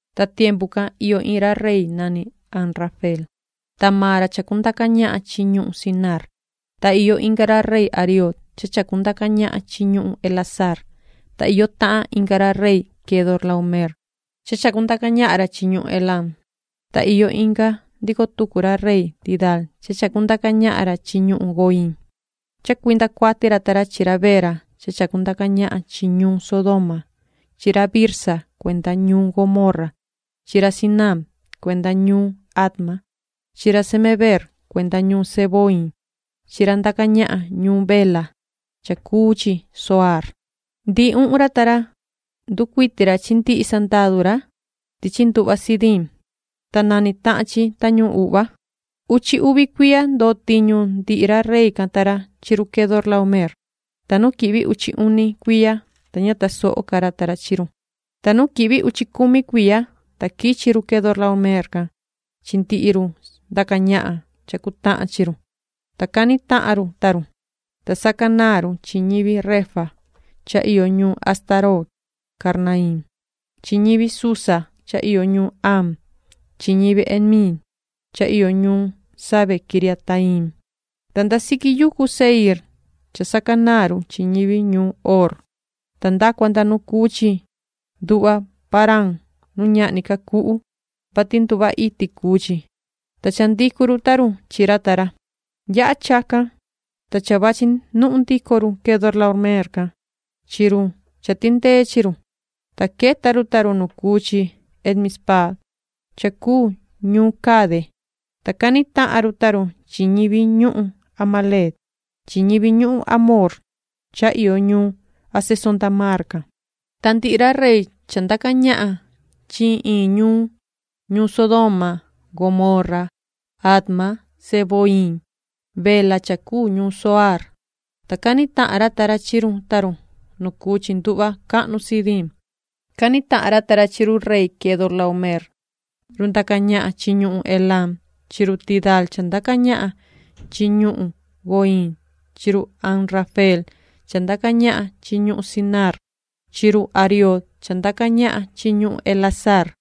Ta tiempu can iyo iin ra rey nani Amrafeel, ta maan ra chacundaca ñahan chi ñuhun Sinaar, ta iyo inga ra rey Ariooc cha chacundaca ñahan chi ñuhun Elasaar, ta iyo tahan inga ra rey Quedorlaomeer cha chacundaca ñahan ra chi ñuhun Elam, ta iyo inga ndico tucu ra rey Tidaal cha chacundaca ñahan ra chi ñuhun Goiim. Cha cuinda cuati ra ta ra chi ra Bera cha chacundaca ñahan chi ñuun Sodoma chi ra Birsa cuenda ñuun Gomorra chi ra Sinaab cuenda ñuun Adma chi ra Semebeer cuenda ñuun Zeboiim chi ra ndaca ñahan ñuun Bela cha cuu chi Zoaar. Ndihi uhun ra ta ra, nducuiti ra chi ndihi sandadu ra tichi nduhva Sidiim, ta nani tahan chi Tañuhun Uhva. Uchi uvi cuiya ndo tiñu ndihi ra rey can ta ra chi run Quedorlaomeer, ta nu quihvi uchi uni cuiya, ta ña tasoho ca ra ta ra chi run. Ta nu quihvi uchi cumi cuiya, ta quichi run Quedorlaomeer can chi ndihi run ndaca ñahan cha cutahan chi run, ta cani tahan run ta run. Ta sacanaan run chi ñivi refaíta cha iyo ñuun Astarot Karnaiim chi ñivi Zuza cha iyo ñuun Haam chi ñivi Emiit cha iyo ñuun Save-quiriataiim, ta nda siqui yucu Seiir cha sacanaan run chi ñivi ñuun Hoor, ta nda cua nda nu cuu chi nduhva Parán nu ñahni ca cuhu, vati nduhva iti cuu chi, ta cha ndicu run ta run chi ra ta ra. Yaha chacan, ta cha vachi nuhun ndico run Quedorlaomeer can chi run cha tindee chi run. Ta queta run ta run nu cuu chi En-mispaat cha cuu ñuun Cade, ta cani tahan run ta run chi ñivi ñuhun Amalec chi ñivi amorreo cha iyo ñuun Hazezontamaar can. Ta ndihi ra rey cha ndaca ñahan chi iin iin ñuun, ñuun Sodoma, Gomorra, Adma, Zeboiim, Bela cha cuu ñuun Zoaar, ta cani tahan ra ta ra chi run ta run nu cuu chi nduhva cahnu Sidiim. Cani tahan ra ta ra chi run rey Quedorlaomeer run ndaca ñahan chi ñuhun Elam chi run Tidaal cha ndaca ñahan chi ñuhun Goiim chi run Amrafeel cha ndaca ñahan chi ñuhun Sinaar chi run Ariooc cha ndaca ñahan chi ñuhun Elasaar.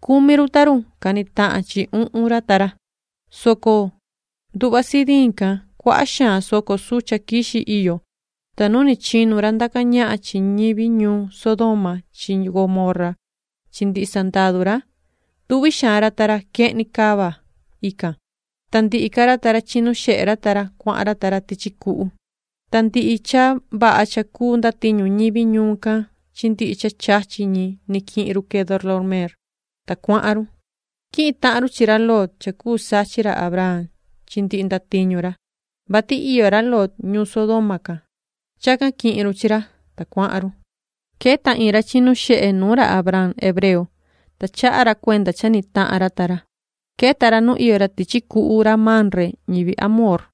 Cumi run ta run cani tahan chi uhun ra ta ra, soco nduhva Sidiim can cuaha xaan soco sucha quixi iyo, ta nu ni chinu ra ndaca ñahan chi ñivi ñuun Sodoma chi Gomorra chi ndihi sandadu ra, tuvi xaan ra ta ra quehni cava ican, ta ndihi ca ra ta ra chinu xehe ra ta ra, cuahan ra ta ra tichi cuhu. Ta ndihi cha vaha cha cuu ndatiñu ñivi ñuun can chi ndihi cha chachi ñi quihin run Quedorlaomeer, ta cuahan run. Quihin tahan run chi ra Lot cha cuu sachin ra Abraam chi ndihi ndatiñu ra, vati iyo ra Lot ñuun Sodoma can. Chacan quihin run chi ra, ta cuahan run. Queta iin ra chinu xehe nuun ra Abraam hebreo, ta chaha ra cuenda cha ni tahan ra ta ra. Queta ra nu iyo ra tichi cuhu ra Mamre ra amorreo,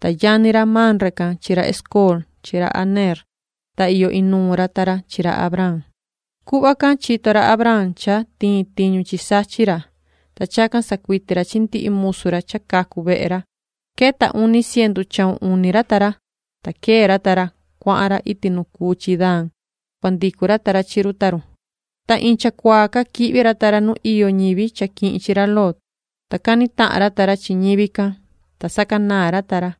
ta yani ra Mamre can chi ra Escol chi ra Aneer, ta iyo inuun ra ta ra chi ra Abraam. Cuhva can chito ra Abraam cha tiin tiñu chi sachin ra, ta chacan sacuiti ra chi ndihi musu ra cha cacu vehe ra. Queta uni cientu chahun uni ra ta ra, ta quee ra ta ra, cuahan ra iti nu cuu chi Dan cua ndicu ra ta ra chi run ta run. Ta iin chacuaa ca quihvi ra ta ra nu iyo ñivi cha quihin chi ra Lot, ta cani tahan ra ta ra chi ñivi can, ta sacanaan ra ta ra,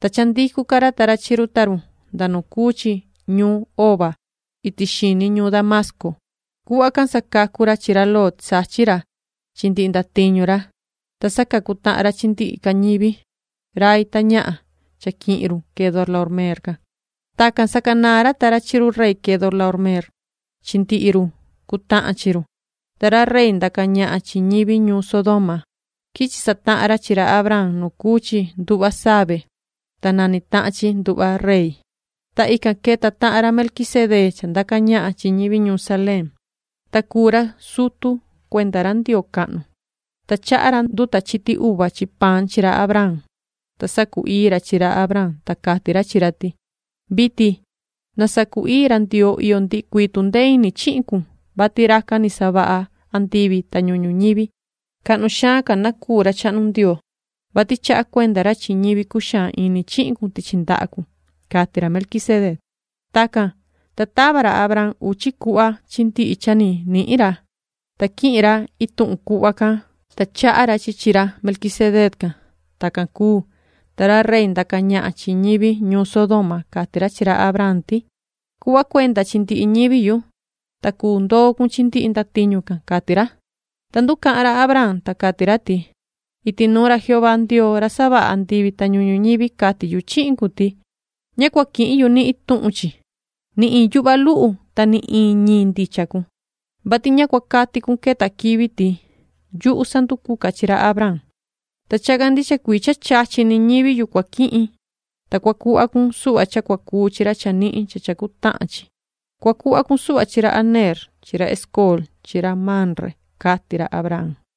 ta cha ndicu ca ra ta ra chi run ta run nda nu cuu chi ñuun Hoba iti xini ñuun Damasco. Cuhva can sacacu ra chi ra Lot sachin ra chi ndihi ndatiñu ra, ta sacacu tahan ra chi ndihi ca ñivi, rai ta ñahan cha quihin run Quedorlaomeer can. Tacan sacanaan ra ta ra chi run rey Quedorlaomeer chi ndihi run cutahan chihin run, ta ra rey ndaca ñahan chi ñivi ñuun Sodoma, quichi satahan ra chi ra Abraam nu cuu chi Nduhva Save, ta nani tahan chi Nduhva Rey. Ta ican queta tahan ra Melquisedee cha ndaca ñahan chi ñivi ñuun Saleem, ta cuu ra sutu cuenda ra Ndioo cahnu, ta chaha ra nduta uva chi paan chi ra Abraam. Ta sacu-ii ra chi ra Abraam, ta cati ra chi ra ti: “Vitin na sacu-ii ra Ndioo iyo ndihi cuii tundee ini chihin cun, vati racan ni savaha andivi ta ñuhun ñuñivi. Cahnu xaan ca na cuu ra chahnu Ndioo, vati chaha cuenda ra chi ñivi cuxaan ini chihin cun tichi ndaha cun”, cati ra Melquisedec. Tacan, ta tava ra Abraam uchi cuhva chi ndihi cha ni nihin ra, ta quihin ra ituhun cuhva can, ta chaha ra chi chi ra Melquisedee can. Tacan cuu, ta ra rey ndaca ñahan chi ñivi ñuun Sodoma, cati ra chi ra Abraam ti: ―Cuhva cuenda chi ndihi ñivi yu, ta cuu ndoo cun chi ndihi ndatiñu can ―cati ra. Ta nducahan ra Abraam, ta cati ra ti: ―Iti nuun ra Jehová Ndioo ra savaha andivi ta ñuhun ñuñivi cati yu chihin cun ti: Ña cua quihin yu ni ituhun chi, ni iin yuhva luhu ta ni iin ñiin ndicha cun, vati ña cua cati cun queta quivi ti: “Yuhu sanducuca chi ra Abraam”. Ta chacan ndicha cuii cha chachi ñivi ni yu cua quihin, ta cua cuhva cun suhva cha cua cuu chi ra chanihin cha cha cutahan chi. Cua cuhva cun suhva chi ra Aneer chi ra Escol chi ra Mamre ―cati ra Abraam.